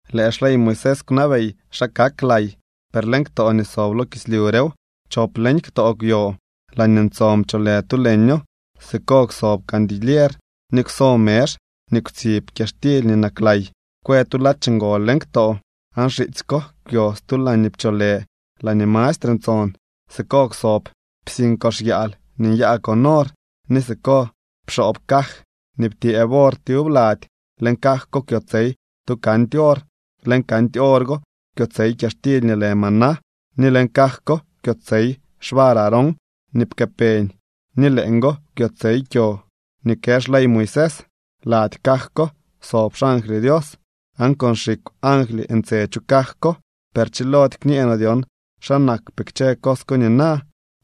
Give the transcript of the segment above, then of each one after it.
Lëë xley Moisés kwnabey xa kak lay, per leñ ktoo nii sob lo kislyu rew. Chop leñ ktoo kwyo. Laañee ntson pcholë tu leño. Siko kwsob candilier ni kwso mezh nii kwtsib kyaxtily nii naklay. Kwë tu ladx ngol leñ ktoo, aan xitsy ko kwyo stu laañee pcholë “laañee mastre ntson”. Siko kwsob psiñ kox yaal nii nyaa con or, ni siko pxoob caj nii ptyëëb or tyub lady. Leñ caj ko kwyotsey tu candy or. Leñ candy or go kwyotsey kyaxtily nii lë maná, ni leñ caj ko kwyotsey xvar Aarón nii pkëpeñ, ni leeñgo kwyotsey kyo nii kë xley Moisés. Lady caj ko sob xangly Dios, aan con xikw angly ntse chu caj ko. Per chilody kñee noo dyon xa nakpee kchë cos ko nina.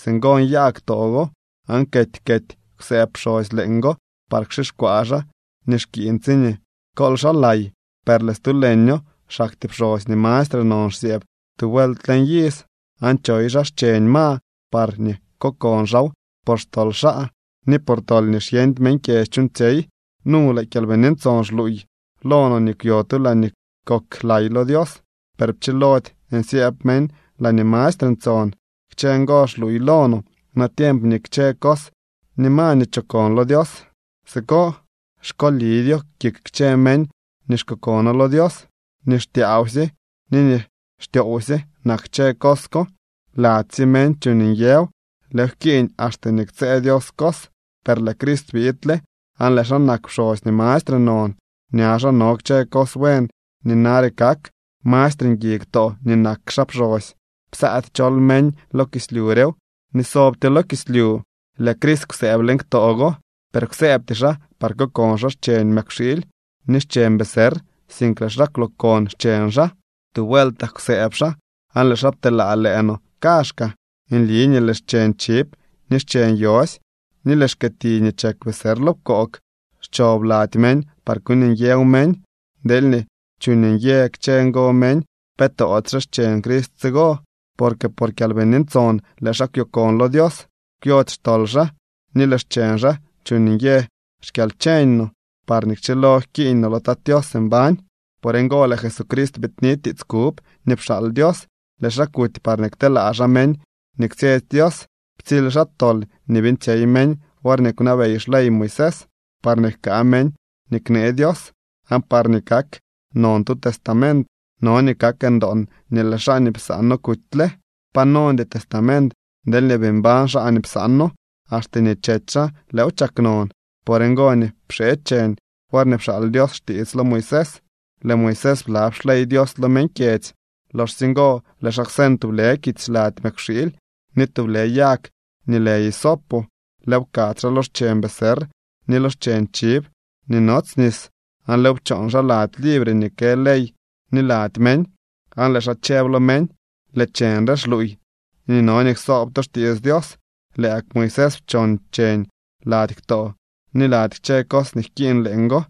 Singo nyaa ktoo go, aan kety kety kwsëëb pxosy leeñgo par kxixkwaa xaa nii xkiiñ tsiñee kool xaa lay. Per lëë stu leño xaktyee pxosy nii mastre non xsyëëb tu vuelt leñ iz, aan choy xaa xcheñ ma parñee kokon xaaw por xtol xaa ni por tol nii xyeñdy meñ kyedzy chuuñtsyey. Nu lëë Kyalbini Ntson xluuy lo no nii kwyo tu laañee kok lay lo Dios, per pchilody nsyëëb meñ laañee mastre ntson. Kchë ngo xluuy lo no natiemp nii kchë cos ni ma nii chokon lo Dios siko, xkolidyo kik kchë meñ nii xkokono lo Dios. Nii xtyaawsye ni nii xtyoowsye nak kchë cos ko. Ladysye meñ chuuñ nyëw. Lëëw jkiiñ axte nii ktsëë Dios cos. Per lëë Crist biidle, aan lëë xaa nak pxosy nii mastre non. Ña xaa no kchë cos buen nii nare kak. Mastre ngui ktoo nii nak xaa pxosy. Psaady chol meñ lo kislyu rew ni sobtyo lo kislyu. Lëë Crist kwsëëb leñ ktoo go, per kwsëëbty xaa par kokon xaa xcheñ mëkwxiily ni xcheñ becerr, sink lëë xaa kwlookon xcheñ xaa. Tu vueltak kwsëëb xaa, aan lëë xaa pteelaa lëë no kaazhkaa. Nli nii lëë xcheñ chiv, ni xcheñ yosy, ni lëë xkiti nii chek becerr lo pkoog, xchob lady meñ par kuuñ nyëw meñ. Deelñee chuuñ nyë kchë ngo meñ, ¿pe toodyxe xcheñ Crist tsigo? Porque por Kyalbini Ntson lëë xaa kwyokon lo Dios. Kwyody xtol xaa, ni lëë xcheñ xaa chuuñ nyë xkyalcheñ no, parñee kchilo jkiiñ no lo Tat Tios mbañ. Por ngo lëë Jesucrist biidni tiits kub nii pxaal Dios. Lëë xaa kuty parñee kteelaa xaa meñ nii kwtsyetsy Dios. Ptsily xaa tol nii beeñtsyey meñ worñee kwnabey xley Moisés, parñee jkaa meñ nii knee Dios. Aan parñee kak non tu testament, no nii kak ndoon nii lëë xaa nii psaano kutyle. Pa nondy testament deelñee bii mbañ xaa nii psaano. Axte nii chety xaa lëëw chak non. Por ngo nii pxee cheñ worñee pxaal Dios xtiits lo Moisés. Lëë Moisés blab xley Dios lo meñ kyedzy. Loxsye ngo lëë xaa kwseñ tublë kits lady mëkwxiily ni tublë yag nii lë hisopo, lëëw pkadz xaa lo xcheñ becerr ni lo xcheñ chiv nii nots nis, aan lëëw pchoon xaa lady libre nii kë ley ni lady meñ. Aan lëë xaa chëb lo meñ: “Lëë cheñ re xluuy nii no nii ksoob to xtiits Dios.” Lëë gak Moisés pchoon cheñ lady ktoo ni lady kchë cos nii jkiiñ leeñgo.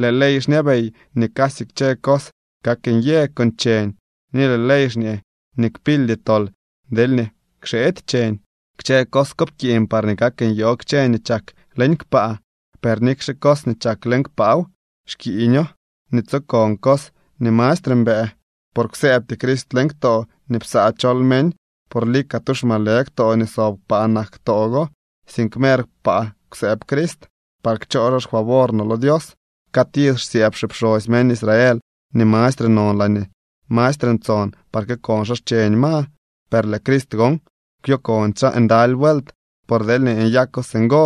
Lëë ley xñabey nii casy kchë cos kak nyë con cheñ ni lëë ley xñee nii kpildy tol deelñee kxeedy cheñ. Kchë cos ko pkiiñ parñee kak nyoo kchë nii chak leñ kpaa. Per nikxe cos nii chak leñ kpaaw, xkiiño nii tsokon cos nii mastre mbëë. Por kwsëëbty Crist leñ ktoo nii psaa chol meñ, por lika tu xmalë ktoo nii sob kpaa nak ktoo go. Sink mer kpaa kwsëëb Crist, par kchoo xaa xfavor no lo Dios. Cad iz xsyëëb xipxosy meñ Israel nii mastre non laañee mastre ntson par kokon xaa xcheñ ma. Per lëë Crist gon kwyokondy xaa ndaly vuelt. Por deelñee nyako singo,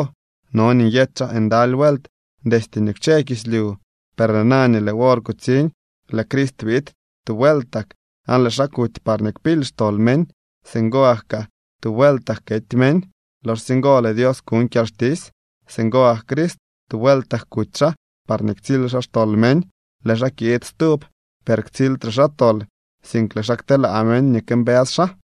no nii nyety xaa ndaly vuelt destye nii kwche kislyu. Per lëë na nii lëë wor kutsiñ, lëë Crist biid tu vueltak, aan lëë xaa kuty parñee kpily xtol meñ. Singo gak kaa tu vueltak kety meñ. Loxsye ngo lëë Dios kuñ kyalxtisy. Singo gak Crist, tu vueltak kuty xaa parñee ktsily xaa xtol meñ. Lëë xaa kiid stub, per ktsildre xaa tol, sink lëë xaa kteelaa meñ nii këmbës xaa.